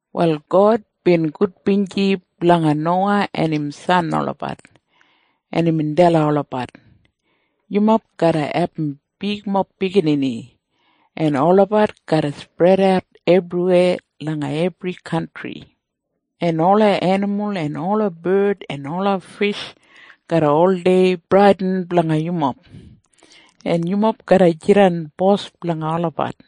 Wal God bin gudbinji blanga Nowa en im san olabat, en imbin dalim olabat, “Yumob garra abum bigmob biginini, en olabat garra spredat ebriweya langa ebri kantri. En ola enimul en ola bard en ola fish garra oldei bradin blanga yumob, en yumob garra jidan bos blanga olabat.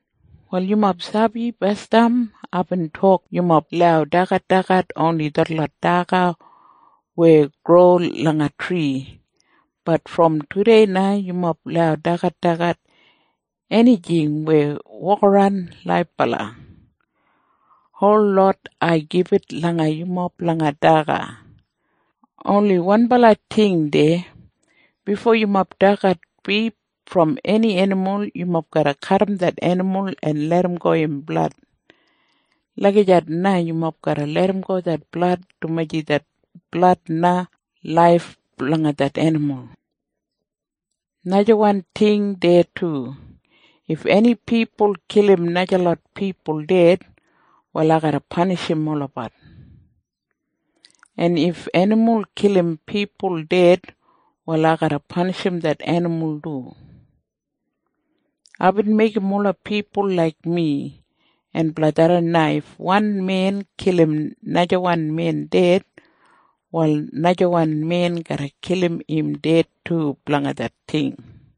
“Wal yumob sabi basdam aibin tok yumob lau dagadagat oni detlot daga weya gro langa tri. Bat brom tudei na yumob lau dagadagat enijing weya wokaran laibala. Holot ai gibit langa yumob blanga daga. Oni wanbala ting deya. Bifo yumob dagat bif brom eni enimul, yumob garra kadim det enimul en larramgo im blad. Lagijat na yumob garra larramgo det blad dumaji det blad na laif blanga det enimul. “Najawan ting deya du. If eni pipul kilim najalot pipul ded, wal ai garra panishim olabat. En if enimul kilim pipul ded, wal ai garra panishim det enimul du. Aibin meigim ola pipul laik mi, en blanga tharran na if wan men kilim najawan men ded, wal najawan men garra kilim im ded du blanga det ting.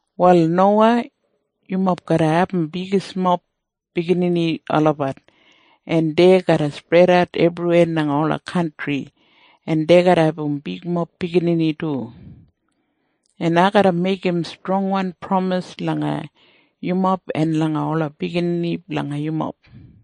“Wal, Nowa, yumob garra abum bigismob biginini olabat, en dei garra spredat ebriweya langa ola kantri, en dei garra abum bigmob biginini du. En ai garra meigim strongwan pramis langa yumob en langa ola biginini blanga yumob.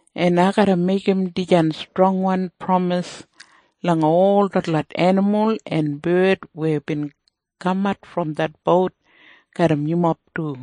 En ai garra meigim dijan strongwan pramis langa ol detlot enimul en bard weya bin kamat brom det bout garram yumob du.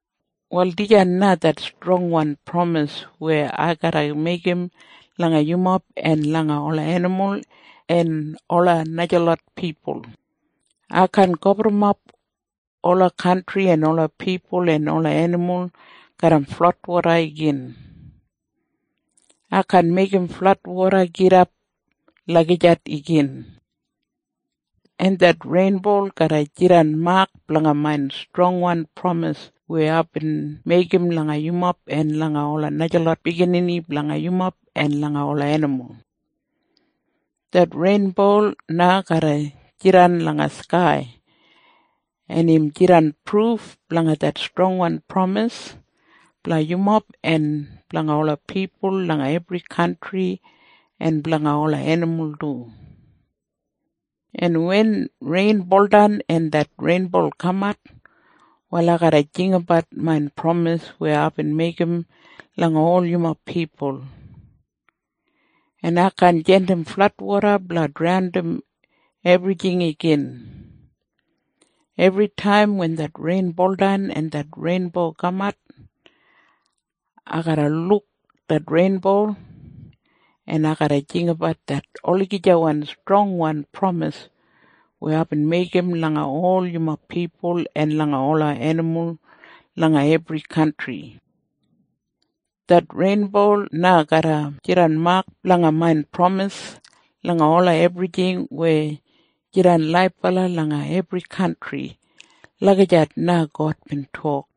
“Wal dijan na det strongwan pramis weya ai garra meigim langa yumob en langa ola enimul en ola najalot pipul. Ai kaan gaburrumap ola kantri en ola pipul en ola enimul garram fladwoda igin. Ai kaan meigim fladwoda gidap lagijat igin. En det reinbo garra jidan mak blanga main strongwan pramis weya aibin meigim langa yumob en langa ola najalot biginini blanga yumob en langa ola enimul. Det reinbo na garra jidan langa skai, en im jidan pruf blanga det strongwan pramis blanga yumob en blanga ola pipul langa ebri kantri en blanga ola enimul du. En wen rein buldan en det reinbo kamat, wal ai garra jinggabat main pramis weya aibin meigim langa ol yumob pipul. En ai kaan jandim fladwoda blanga draundim ebrijing igin. Ebritaim wen rein buldan en det reinbo kamat, ai garra luk det reinbo, en ai garra jinggabat det olagijawan strongwan pramis weya aibin meigim langa ol yumob pipul en langa ola enimul langa ebri kantri. Det reinbo na garra jidan mak blanga main pramis langa ola ebrijing weya jidan laibala langa ebri kantri.” Lagijat na God bin tok.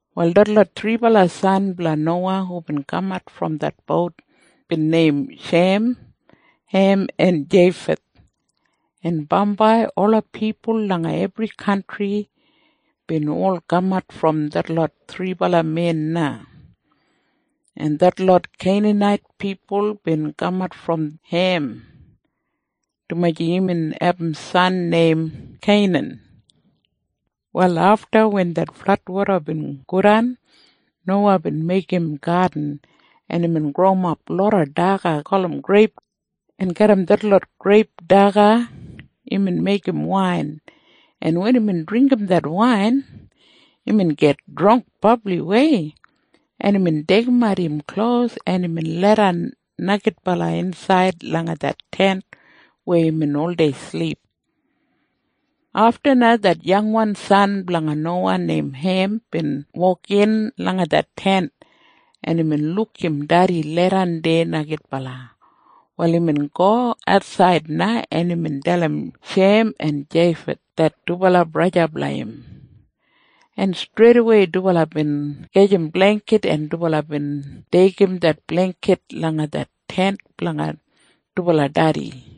Wal detlot thribala san blanga Nowa hubin kamat brom det bout bin neim Shem, Hem en Jeifeth, en bambai ola pipul langa ebri kantri bin ol kamat brom detlot thribala men na. En detlot Keinanait pipul bin kamat brom Hem, dumaji imbin abum san neim Keinan. Wal afta wen det fladwoda bin godan, Nowa bin meigim gadin, en imbin growimap loda daga gulum greip, en garram detlot greip daga imbin meigim wain, en wen imbin dringgim det wain, imbin git drangk brabliwei, en imbin deigimat im klos, en imbin leidan neigidbala insaid langa det tent weya imbin oldei silip. Afta na det yangwan san blanga Nowa neim Hem bin wokin langa det tent, en imbin luk im dedi leidan deya neigidbala. Wal imbin go atsaid na, en imbin dalim Shem en Jeifeth det dubala braja blanga im, en streidawei dubala bin gajim bleingkit, en dubala bin deigim det bleingkit langa det tent blanga dubala dedi.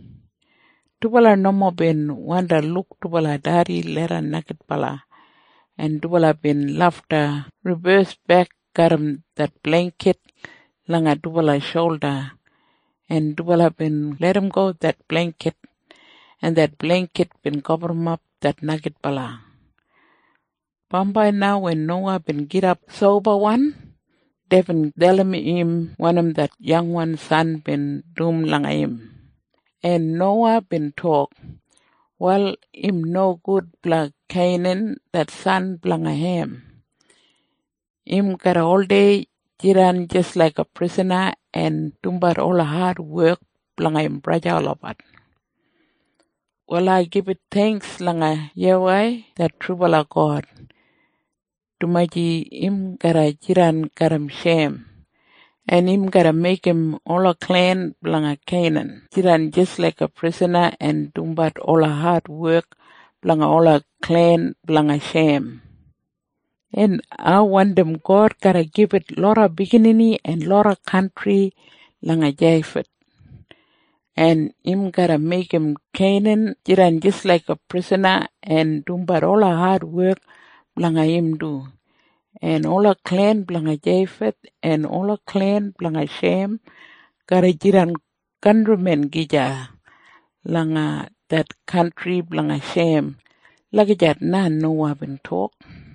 Dubala nomo bin wandi luk dubala dedi leidan neigidbala, en dubala bin lafta ribesbek garram det bleingkit langa dubala sholda, en dubala bin larramgo det bleingkit, en det bleingkit bin gaburrumap det neigidbala. Bambai na wen Nowa bin gidap sobawan, deibin dalim im wanim det yangwan san bin dum langa im, en Nowa bin tok, “Wal im nogud blanga Keinan det san blanga Hem! Im garra oldei jidan jis laiga prisana en dumbat ola adwek blanga im braja olabat. Wal ai gibit theingks langa YAWEI det trubala God, dumaji im garra jidan garram Shem, en im garra meigim ola klen blanga Keinan jidan jis laiga prisana en dumbat ola adwek blanga ola klen blanga Shem. En ai wandim God garra gibit loda biginini en loda kantri langa Jeifeth, en im garra meigim Keinan jidan jis laiga prisana en dumbat ola adwek blanga im du. En ola klen blanga Jeifeth en ola klen blanga Shem garra jidan kantrimen gija langa det kantri blanga Shem.” Lagijat na Nowa bin tok.